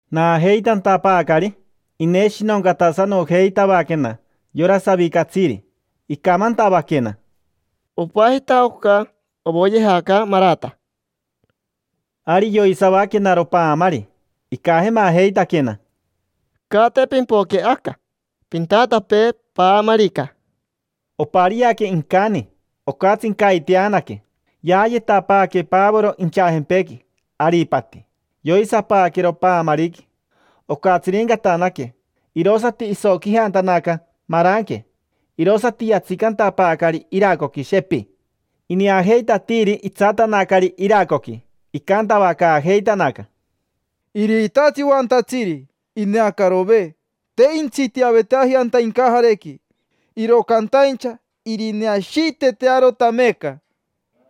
Naajeitantapaacari, ineshinoncatasanojeitavaquena yora savicatsiri. Icamantavaquena: —Opajita oca ovoyejaca Marata. Ari yoisavaquenaro paamari, icajemajeitaquena: —Caate pimpoque aca, pintatapee paamarica. Opariaque incani, ocatsincaiteanaque. Yaayetapaaque Pavoro inchajempequi, aripati. Yoisapaaquero paamariqui. Ocatsirincatanaque, irosati isoquijantanaca maranque, irosati yatsicantapaacari iracoqui, shepi. Ineajeitatiiri itsatanacari iracoqui, icantavacaajeitanaca: —Iriitatsi oantatsiri. Ineacarove. Te intsitiaveteaji anta incajarequi, iro cantaincha irineashiitetearota meeca.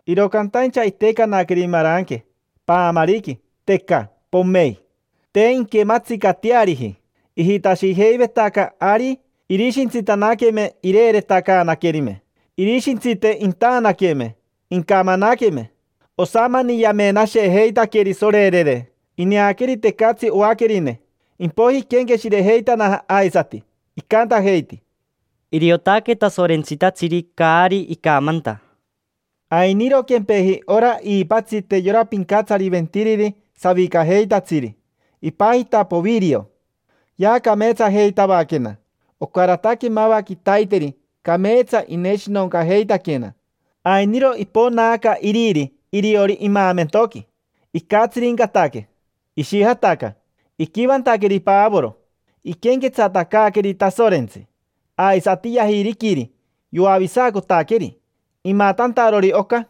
Iro cantaincha itecanaqueri maranque paamariqui, teca, pomein; te inquematsicateariji. Ijitashijeivetaca ari irishintsitanaqueme ireeretacaanaquerime; irishintsite intaanaqueme, incamanaqueme. Osamani yamenashejeitaqueri, sorerere. Ineaqueri tecatsi oaquerine. Impoiji iquenqueshirejeitanaja aisati, icantajeiti: —Iriotaque tasorentsitatsiri caari icamanta. Ainiro quempeji ora iipatsite yora pincatsariventiriri savicajeitatsiri. Ipajita Povirio. Yaacameetsajeitavaquena. Ocarataque mava quitaiteri cameetsa ineshinoncajeitaquena. Ainiro iponaaca iriri iriori imaamentoqui. Icatsirincataque, ishijataca. Iquivantaqueri Pavoro, iquenquetsatacaaqueri Tasorentsi, aisati yajiriquiri, yoavisacotaqueri. Imatantarori oca,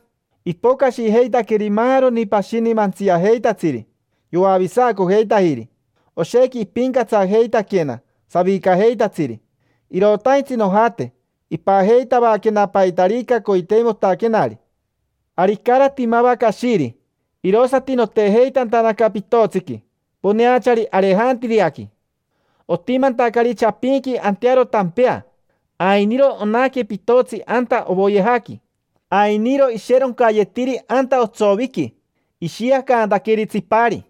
ipocashijeitaqueri maaroni pashini mantsiajeitatsiri. Yoavisacojeitajiri. Oshequi ipincatsajeitaquena savicajeitatsiri. Irotaintsi nojate, ipajeitavaquena paitarica coiteimotaquenari. Ari icarati mava cashiri, irosati notejeitantanaca pitotsiqui poneachari Arejantiriaqui. Otimantacari chapinqui antearo tampea, ainiro onaque pitotsi anta ovoyejaqui. Ainiro isheroncayetiri anta otsoviqui, ishiacantaqueri tsipari.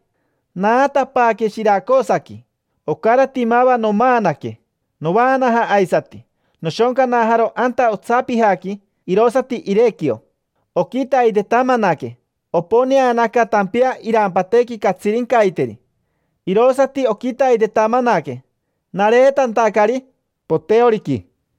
Naatapaaque Shiracosaqui, ocarati mava nomaanaque. Novaanaja aisati, noshoncanajaro anta otsapijaqui, irosati Irequio. Oquitaitetamanaque oponeanaca tampea irampatequi catsirincaiteri. Irosati oquitaitetamanaque nareetantacari Posoriqui.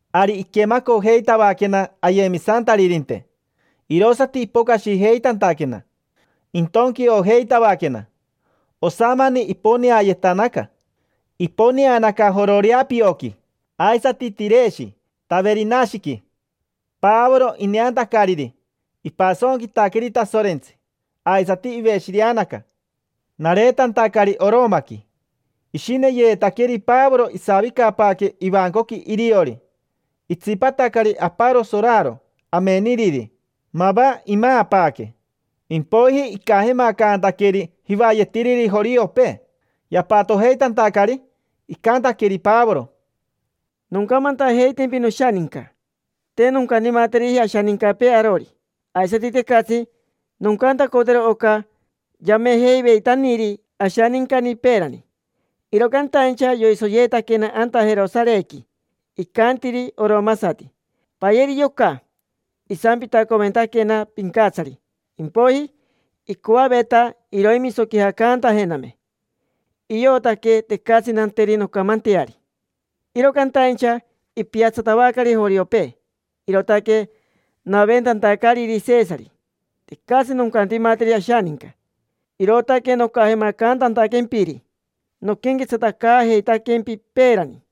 Ari iquemacojeitavaquena ayemisantaririnte, irosati ipocashijeitantaquena, intonquiojeitavaquena. Osamani iponeayetanaca. Iponeanaca Jororeapioqui, aisati Tireshi Taverinashiqui. Pavoro, ineantacariri, ipasonquitaqueri Tasorentsi aisati iveshireanaca. Nareetantacari Oromaqui, ishineyeetaqueri Pavoro isavicapaaque ivancoqui iriori. Itsipatacari aparo soraro, ameniriri. Mava imaapaaque, impoiji icajemacantaqueri jivayetiriri joriopee. Yapatojeitantacari, icantaqueri Pavoro: —Noncamantajeitempi, noshaninca. Te noncantimateriji ashanincapee arori. Aisati tecatsi noncantacotero oca yamejeiveitaniri ashanincani peerani. Iro cantaincha yoisoyeetaquena anta Jerosarequi, icantiri oromasati: “Payeri yoca”. Isampitacoventaquena pincatsari, impoiji icoaveta iroimisoquijacantajename. Iotaque tecatsi nanteri noncamanteari. Iro cantaincha ipiatsatavacari joriopee, irootaque naventantacariri Sesari. Tecatsi noncantimateri ashaninca. Irootaque nocajemacantantaquempiri, noquenquetsatacaajeitaquempi. Peerani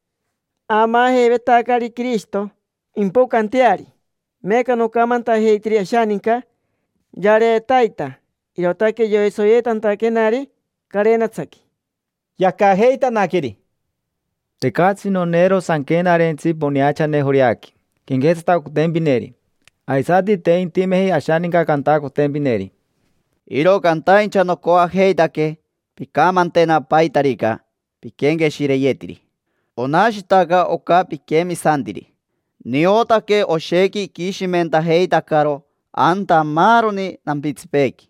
aamaajeivetacari Quirishito impocanteari. Meeca nocamantajeitiri ashaninca yareetaita, irootaque yoisoyeetantaquenari carenatsaqui. Yacajeitanaqueri: —Tecatsi noneero sanquenarentsi poneachane Joreaqui, quenquetsatacotempineri. Aisati te intimeji ashaninca cantacotempineri. Iro cantaincha nocoajeitaque pincamantena paitarica piquenqueshireyetiri. Onashitaca oca piquemisantiri: niotaque oshequi iquishimentajeitacaro anta maaroni nampitsipeequi.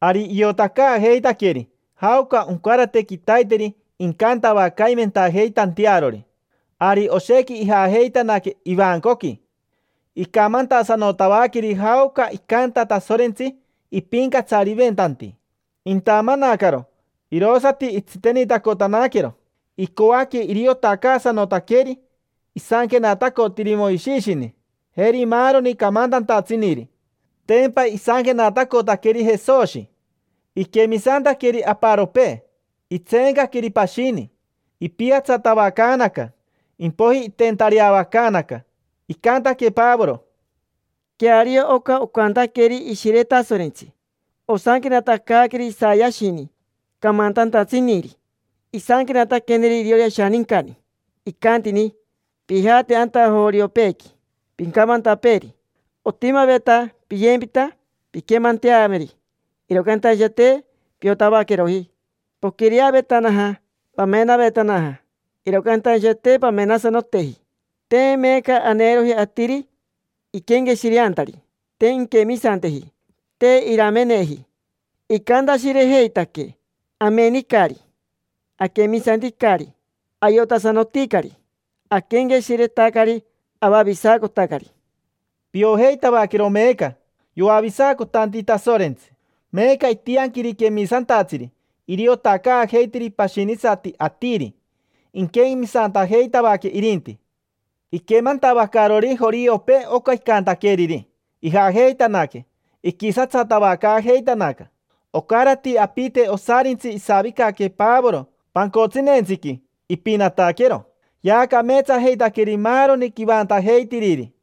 Ari iotacaajeitaqueri jaoca oncarate quitaiteri incantavacaimentajeitantearori. Ari oshequi ijajeitanaque ivancoqui. Icamantasanotavaqueri jaoca icanta Tasorentsi ipincatsariventanti. Intamanacaro, irosati itsitenitacotanaquero. Icoaque iriotacaasanotaqueri isanquenatacotiri Moishishini, jeri maaroni camantantatsiniri: tempa isanquenatacotaqueri Jesoshi. Iquemisantaqueri aparopee, itseencaqueri pashini. Ipiatsatavacaanaca, impoiji iteentareavacaanaca. Icantaque Pavoro: —Queario oca ocantaqueri Ishire Tasorentsi. Osanquenatacaaqueri Isayashini, camantantatsiniri. Isanquenataqueneri iriori ashanincani. Icantini: “Pijate anta joriopeequi, pincamantapeeri: ‘Otimaveta piyempita pinquemanteameri, iro cantaincha te piotavaqueroji. Poquireavetanaja, pamenavetanaja, iro cantaincha te pamenasanoteji’. Te meeca aneeroji atiri iquenqueshireantari. Te inquemisanteji, te irameneji. Icantashirejeitaque: ‘Amenicari. Aquemisanticari. Ayotasanoticari. Aquenqueshiretacari. Avavisacotacari’”. Piojeitavaquero meeca: yoavisacotanti Tasorentsi. Meeca itianquiri quemisantatsiri iriotacaajeiteri pashinisati atiri. Inquemisantajeitavaque irinti. Iquemantavacarori joriopee oca icantaqueriri, ijajeitanaque, iquisatsatavacaajeitanaca. Ocarati apite osarintsi isavicaque Pavoro pancotsineentsiqui, ipinataquero. Yaacameetsajeitaqueri maaroni quivantajeitiriri.